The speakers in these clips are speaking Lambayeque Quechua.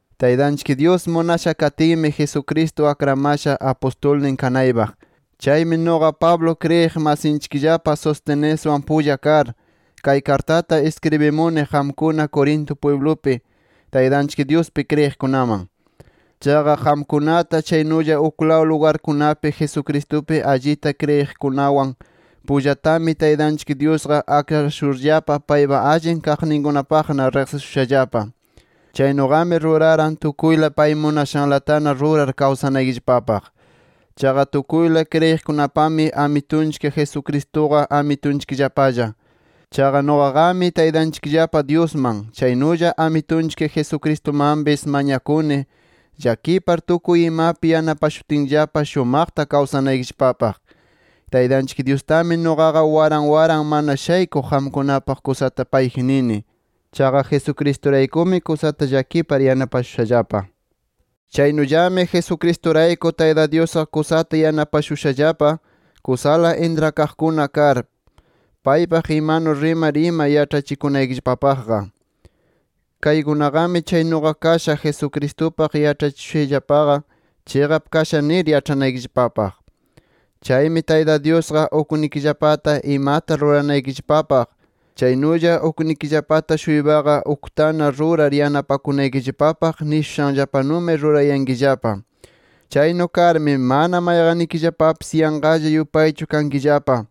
Taytanchik Dyus munasha katinmi, Jesucristo akramasha apustulnin kanaypaq. Chaymi nuqa Pablo kriyiq masinchikllapa Sosteneswan pulla kar, kay kartata iskribimuni qamkuna Corinto pwiblupi, Taytanchik Dyuspi kriyiqkunaman. Chaqa qamkunata, chaynulla uklaw lugarkunapi Jesucristupi allita kriyiqkunawan pullatami, Taytanchik Dyusqa akrashurllapa paypa allin kaqninkunapaqna riqsishushallapa. Chaynuqami ruraran tukuyla pay munashanlatana rurar kawsanaykillapapaq. Chaqa tukuyla kriyiqkunapami Amitunchik Jesucristuqa Amitunchikllapalla. Chaqa nuqaqami Taytanchikllapa Dyusman, chaynulla Amitunchik Jesucristumanpis mañakuni llakipar tukuy imapi yanapashutinllapa shumaqta kawsanaykillapapaq. Taytanchik Dyustami nuqaqa waran waran mana shaykuq qamkunapaq kusata payji nini. Chaqa Jesucristuraykumi, kusata llakipar yanapashushallapa. Chaynullami Jesucristurayku, Tayta Dyusqa kusata yanapashushallapa kusala intrakaqkuna kar, paypaq imanu rimar ima yaĉhachikunaykillapapaqqa. Kaykunaqami chaynuqa kasha Jesucristupaq yaĉhachishushayllapaqa chiqap kasha nir yaĉhanaykillapapaq. Chaymi Tayta Dyusqa uknikillapata imata ruranaykillapapaq, chaynulla uknikillapata-shuypaqa uktana rurar yanapanakunaykillapapaq nishushanllapanumi rurayankillapa. Chaynu karmi, mana mayqannikillapapis yanqalla yupaychu kankillapa.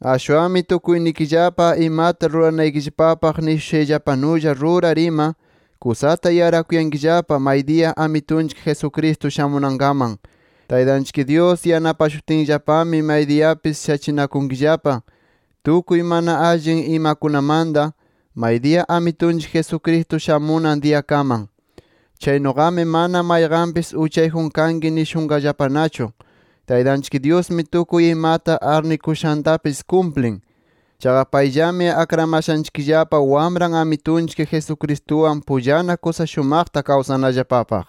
Ashwanmi tukuynikillapa imata ruranaykillapapaq nishushanllapanulla rurar ima, kusata yarakunkillapa maydiya Amitunchik Jesucristo shamunankaman. Taytanchik Dyus yanapashutinllapami, maydiyapis shachinakunkillapa tukuy mana allin imakunamanta, maydiya Amitunchik Jesucristo shamunan diyakaman. Chaynuqami, mana mayqanpis uchayjun kanki nishunqallapanachu. Taytanchik Dyusmi tukuy imata arnikushantapis kumplin. Chaqa payllami akramashanchikllapa, Wamran Amitunchik Jesucristuwan pullana kusa shumaqta kawsanallapapaq.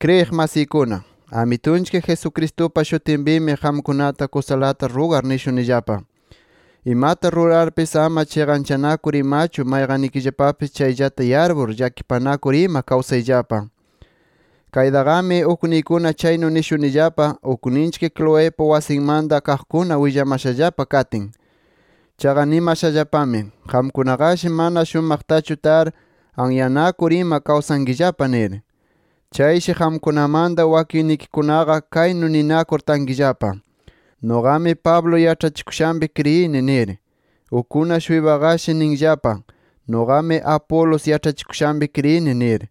Kriyiq masiykuna, Amitunchik Jesucristupa shutinpimi qamkunata kusalata rugar nishunillapa: Imata rurarpis ama chiqanchanakur imachu mayqannikillapapis chayllata yarpur, llakipanakur ima kawsayllapa. Kaytaqami ukniykuna chaynu nishunillapa, ukninchik Cloepa wasinmanta kaqkuna willamashallapa katin. Chaqa nimashallapami, qamkunaqashi mana shumaqtachu tar anyanakur ima kawsankillapa nir. Chayshi qamkunamanta wakinnikikunaqa kaynu ninakur tankillapa: “Nuqami Pablo yaĉhachikushanpi kriyini” nir. Ukkuna-shuypaqashi ninllapa: “Nuqami Apolos yaĉhachikushanpi kriyini” nir.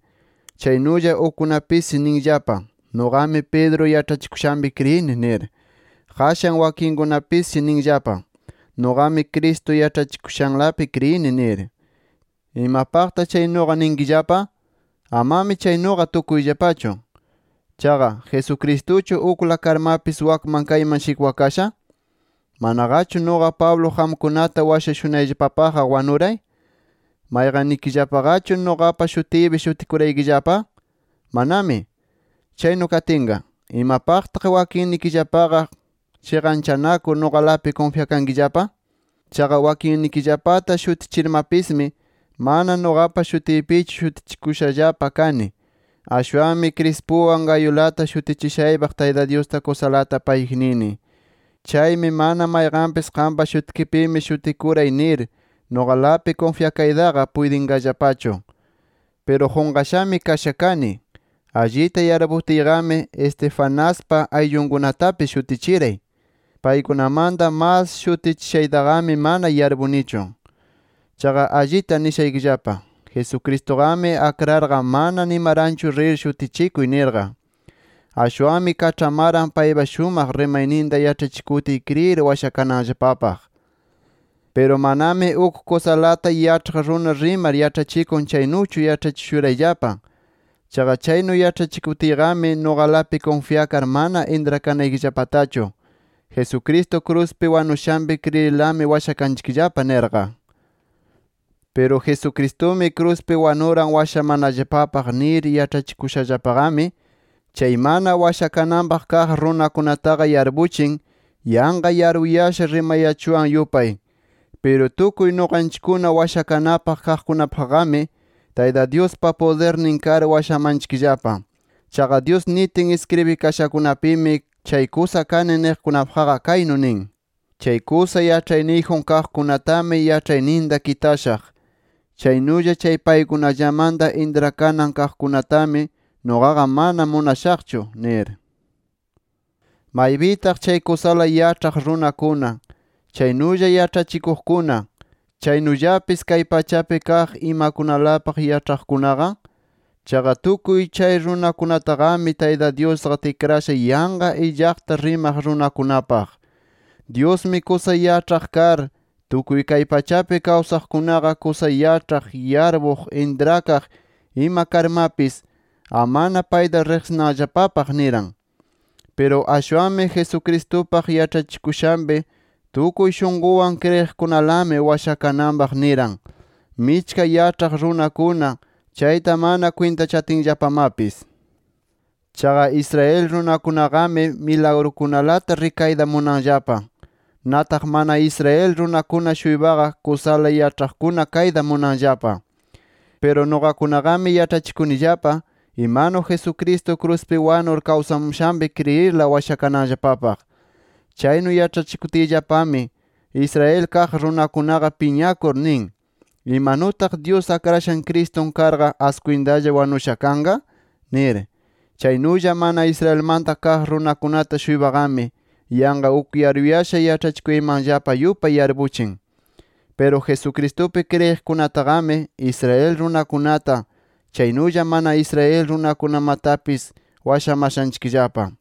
Chaynulla ukkunapisshi ninllapa: “Nuqami Pedro yaĉhachikushanpi kriyini” nir. Qashan wakinkunapisshi ninllapa: “Nuqami Cristo yaĉhachikushanlapi kriyini” nir. ¿Imapaqta chaynuqa ninkillapa? Amami chaynuqa tukuyllapachu. Chaqa ¿Jesucristuchu ukla karmapis wakman kayman shikwakasha? ¿Manaqachu, nuqa Pablo qamkunata washashunayllapapaqqa wanuray? ¿Mayqannikillapallaqachu nuqapa shutiypi shutikuraykillapa? ¡Manami! Chaynu katinqa, ¿imapaqtaq wakinnikillapaqa chiqanchanakur, nuqalapi kunfyakankillapa? Chaqa wakinnikillapata shutichirmapismi, mana nuqapa shutiypichu shutichikushallapa kani. Ashwanmi Crispuwan Gayulata shutichishaypaq Tayta Dyusta kusalata payji nini. Chaymi mana mayqanpis qampa shutikipimi shutikuray nir, nuqalapi kunfyakaytaqa puytinqallapachu. Piru qunqashami kasha kani. Allita yarputiyqami Estefanaspa ayllunkunatapis shutichiray. Paykunamanta mas shutichishaytaqami mana yarpunichu. Chaqa allita nishaykillapa: Jesucristuqami akrarqa mana nimaranchu rir shutichikuy nirqa. Ashwanmi kaĉhamaran paypa shumaq rimayninta yaĉhachikutiy kriyir washakananllapapaq. Piru manami uk kusalata yaĉhaq runa rimar yaĉhachikun chaynuchu yaĉhachishurayllapa. Chaqa chaynu yaĉhachikutiyqami, nuqalapi kunfyakar mana intrakanaykillapatachu, Jesucristo kruspi wanushanpi kriyirlami washakanchikllapa nirqa. Piru Jesucristumi kruspi wanuran washamanallapapaq nir yaĉhachikushallapaqami, chay mana washakananpaq kaq runakunataqa yarpuchin yanqa yaruyasha rimayachuwan yupay. Piru tukuy nuqanchikkuna washakanapaq kaqkunapaqqami, Tayta Dyuspa pudirnin kar washamanchikllapa. Chaqa Dyus nitin iskribikashakunapimi, chay kusa kani niqkunapaqqa kaynu nin: “Chay kusa yaĉhayniyjun kaqkunatami yaĉhayninta kitashaq. Chaynulla chay paykunallamanta intrakanan kaqkunatami nuqaqa mana munashaqchu” nir. ¿Maypitaq chay kusala yaĉhaq runakuna, chaynulla yaĉhachikuqkuna, chaynullapis kay pachapi kaq imakunalapaq yaĉhaqkunaqa? Chaqa tukuy chay runakunataqami, Tayta Dyusqa tikrasha yanqa illaqllata rimaq runakunapaq. Dyusmi kusa yaĉhaq kar, tukuy kay pachapi kawsaqkunaqa, kusa yaĉhaq, yarpuq intrakaq ima karmapis, amana payta riqsinanllapapaq niran. Piru ashwanmi Jesucristupaq yaĉhachikushanpi tukuy shunqunwan kriyiqkunalami washakananpaq niran, michka yaĉhaq runakuna chayta mana kwintachatinllapamapis. Chaqa Israel runakunaqami milagrukunalata rikayta munanllapa. Nataq mana Israel runakuna-shuypaqa, kusala yaĉhaqkuna kayta munanllapa. Piru nuqakunaqami yaĉhachikunillapa imanu Jesucristo kruspi wanur kawsamushanpi kriyirla washakananllapapaq. Chaynu yaĉhachikutiyllapami Israel kaq runakunaqa piñakur nin, ¿imanutaq Dyus Akrashan Cristun karqa askwintalla wanusha kanqa? nir. Chaynulla mana Israelmanta kaq runakunata-shuypaqami yanqa uk yaruyasha yaĉhachikuyaymanllapa yupay yarpuchin. Piru Jesucristupi kriyiqkunataqami, Israel runakunata, chaynulla mana Israel runakunamatapis washamashanchikllapa.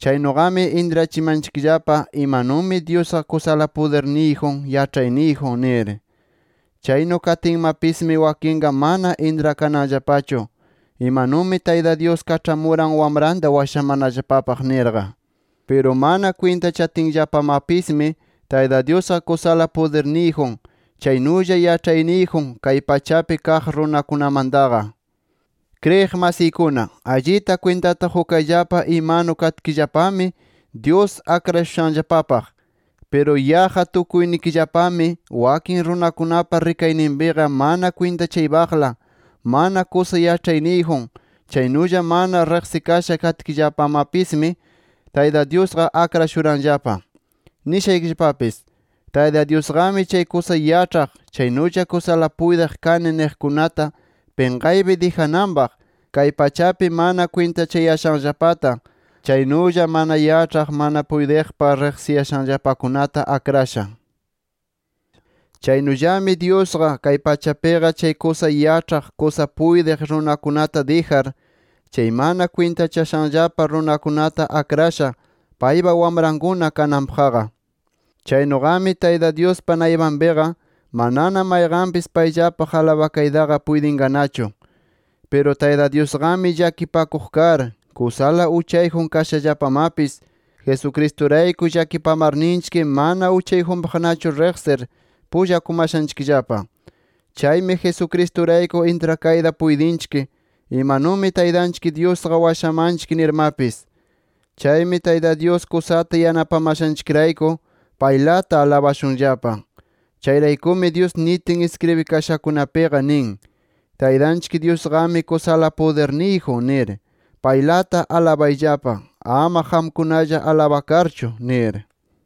Chaynuqami, intrachimanchikllapa imanumi Dyusqa kusala pudirniyjun, yaĉhayniyjun nir. Chaynu katinmapismi wakinqa mana intrakananllapachu imanumi Tayta Dyus kaĉhamuran Wamranta washamanallapapaq nirqa. Piru mana kwintachatinllapamapismi Tayta Dyusqa kusala pudirniyjun, chaynulla yaĉhayniyjun kay pachapi kaq runakunamantaqa. Kriyiq masiykuna, allita kwintata qukayllapa imanu katkillapami Dyus akrashushanllapapaq. Piru yaqqa tukuynikillapami, wakin runakunapa rikayninpiqa mana kwintachaypaqla, mana kusa yaĉhayniyjun, chaynulla mana riqsikasha katkillapamapismi Tayta Dyusqa akrashuranllapa. Nishaykillapapis: Tayta Dyusqami chay kusa yaĉhaq, chaynulla kusala puytiq kani niqkunata pinqaypi dijananpaq, kay pachapi mana kwintachayashanllapata, chaynulla mana yaĉhaq, mana puytiqpaq riqsiyashanllapakunata akrasha. Chaynullami Dyusqa, kay pachapiqa chay kusa yaĉhaq, kusa puytiq runakunata dijar, chay mana kwintachashanllapa runakunata akrasha, paypa wamrankuna kananpaqqa. Chaynuqami, Tayta Dyuspa naypanpiqa manana mayqanpis payllapaq alabakaytaqa puytinqanachu. Piru Tayta Dyusqami llakipakuq kar, kusala uchayjun kashallapamapis, Jesucristurayku llakipamarninchik mana uchayjunpaqnachu riqsir, pullakumashanchikllapa. Chaymi Jesucristurayku intrakayta puytinchik imanumi Taytanchik Dyusqa washamanchik nirmapis. Chaymi Tayta Dyus kusata yanapamashanchikrayku, paylata alabashunllapa. Chayraykumi Dyus nitin iskribikashakunapiqa nin: “Taytanchik Dyusqami kusala pudirniyjun nir paylata alabayllapa, ama qamkunalla alabakarchu” nir.